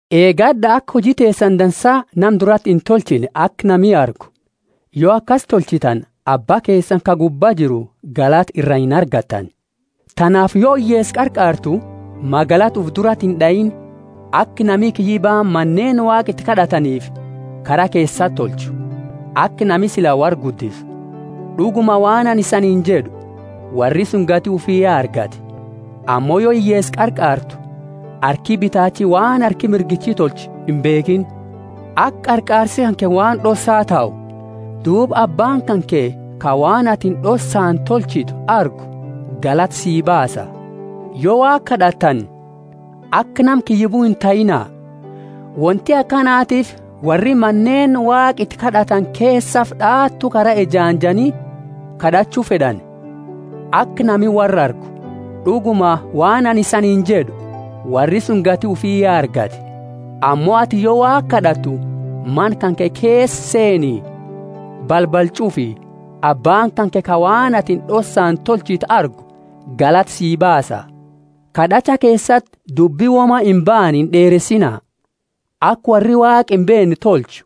Eegad'a aka huji teesani dansa nama durati intolchine aka nami argu. Yo akasi tolchitani Abba keesani ka gubba jiru galata ira inargattani. Tanaafi yo hiyyeesa qarqaartu, magalata ufi durati ind'aiini, aka nami kiyyibaani Maneeni Waaqa iti kad'ataniifi kara keesati tolchu, aka nami sila worra guddisu. D'uguma waan anini isaniini jed'u, Worri suni gati ufi ya argate. Ammo yo hiyyeesa qarqaartu harki bitaachi waan harki mirgichi tolchu imbeekhiini, aka qarqaarsi kanke waan d'ossa tahu, duuba Abbaani kanke ka waan atini d'ossaani tolchitu argu galata si baasa. Yo Waaqa kad'attani, aka nama kiyyibu intahiina! Wonti akanatiifi worri Maneeni Waaqa iti kad'atani keesafi d'aatu kara ejaanjani kad'achu fed'ani, aka nami worra argu. D'uguma, waan anini isaniini jed'u, Worri suni gati ufi ya argate. Ammo atini yo Waaqa kad'attu mana kanke keesa seeni, balbala ch'ufi Abbaani kanke ka waan atini d'ossani tolchitu argu galata sii baasa. Kad'acha keesati dubbi woma imbaane ind'eeresiina, aka worri Waaqa imbeenne tolchu;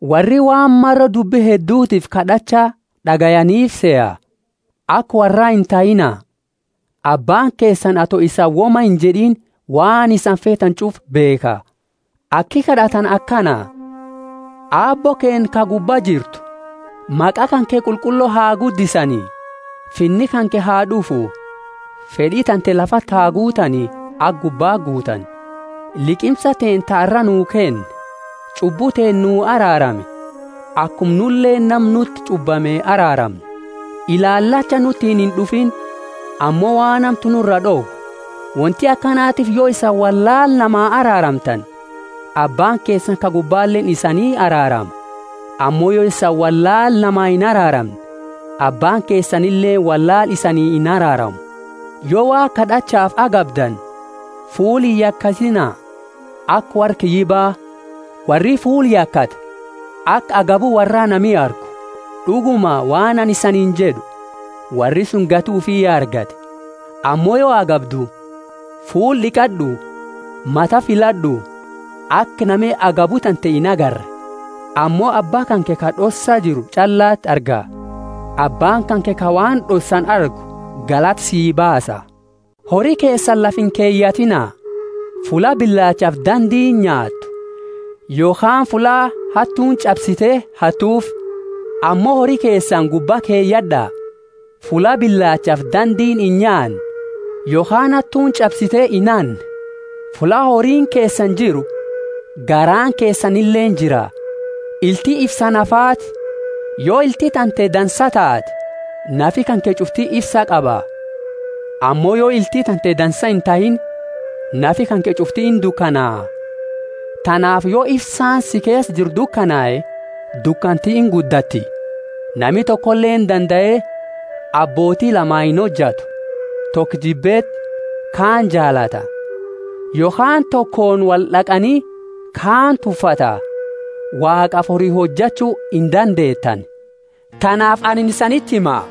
worri waan maro dubbi heddutiifi kad'acha d'agayaniifi seha. Aka worra intahiina; Abbaani keesani ato isani woma injed'ini waan isani feetani ch'ufa beekha. Aki kad'atani akana: Aabbo keenna ka gubba jirtu, maqa kanke qulqullo ha guddisani; Finni kanke ha d'ufu, fed'i tante lafati ha guutani aka gubbaa guutani. Liqimsa teenna ta arra nuu kenni; ch'ubbu teenna nuu araarami, akuma nuleeni nama nuti ch'ubbame araaramnu. Ilaalacha nutiini ind'ufiini, ammo waan hamtu nuraa d'owi. Wonti akanatiifi yo isani wollaala namaa araaramtani, Abbaani keesani ka gubbaleeni isani araarama. Ammo yo isani wollaala namaa inaraaramne, Abbaani keesanileeni wollaala isanii inaraaramu. Yo Waaqa kad'achaafi agabdani, fuula iyakatiina, aka worra kiyyiba. Worri fuula yakata, aka agabu worraa nami argu. D'uguma, waan anini isaniini jed'u, Worri suni gati ufi ya argate. Ammo yo agabdu, fuula d'iqad'u, mata filad'u, aka nami agabu tante inagarre; ammo Abba kanke ka d'ossa jiru ch'allati arga. Abbaani kanke ka waan d'ossani argu galata sii baasa. Hori keesani lafa inkeyatina, fulla bilaachafi dandiini nyaattu, yokhaani fulla hattuuni ch'absite hattufi. Ammo hori keesani gubba keyad'a, fulla bilaachafi dandiini inyaanne yokhaani hattuuni ch'absite inhanne. Fulla horiini keesani jiru, garaani keesanileeni jira. Ilti ifsa nafaati. Yo ilti tante dansaa taate, nafi kanke ch'ufti ifsa qaba. Ammo yo ilti tante dansaa intahiini, nafi kanke ch'ufti indukanaa. Tanaafi yo ifsaani si keesa jiru dukanae, dukanti inguddatti. Nami tokoleeni dandae abbooti lama inhojatu: toko jibbeti kaani jaalata, yokhaani tokooni wold'aqani kaani tuffata. Waaqafi hori hojachu indandeetani. Tanaafi anini isaniti hima,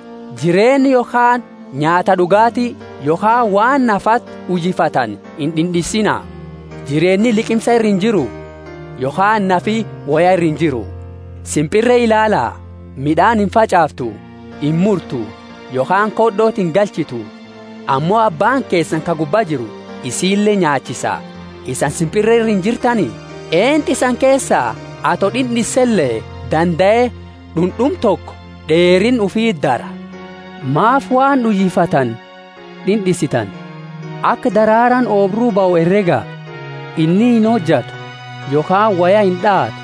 Jireenna yokhaani nyaata d'ugaati, yokhaani waan nafaati uyifatani ind'ind'insiina. Jireenni liqimsa ira injiru: Yokhaani nafi woya ira injiru: Simpirre ilaala; mid'aani imfach'aaftu, imurtu, yokhaani khod'oti ingalchitu; ammo Abbaani keesani ka gubba jiru isile nyaachisa, isani simpirre ira injirtani? Eentu isani keesa, ato d'ind'insele, dandae d'und'uma toko d'eerinna ufiti dara? Maafi waan uyifattani d'ind'insitani? Aka daraaraani oobru bahu herega; inni inhojatu yokhaani woya ind'aatu.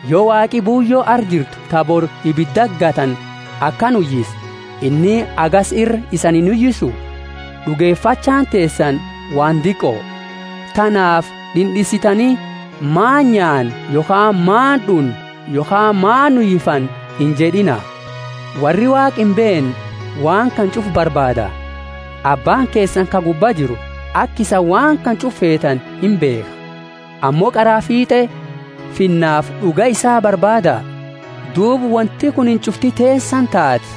Yo Waaqi buuyo arra jirtu ta bori ibidati gatani akana uyise, inni hagasi ira isani inuyisu? D'ugefachaani teesani waan diqoo! Tanaafi d'ind'insitani, Maani nyaanna yokhaani maani d'unna yokhaani maani uyifanna: injed'ina. Worri Waaqa imbeenne waan kana ch'ufa barbaada. Abbaani keesani ka gubba jiru aka isani waan kana ch'ufa feetani imbeekha. Ammo qaraa fiit'e Finnafi d'uga isaa barbaada, duuba wonti kunini ch'ufti teesani taati.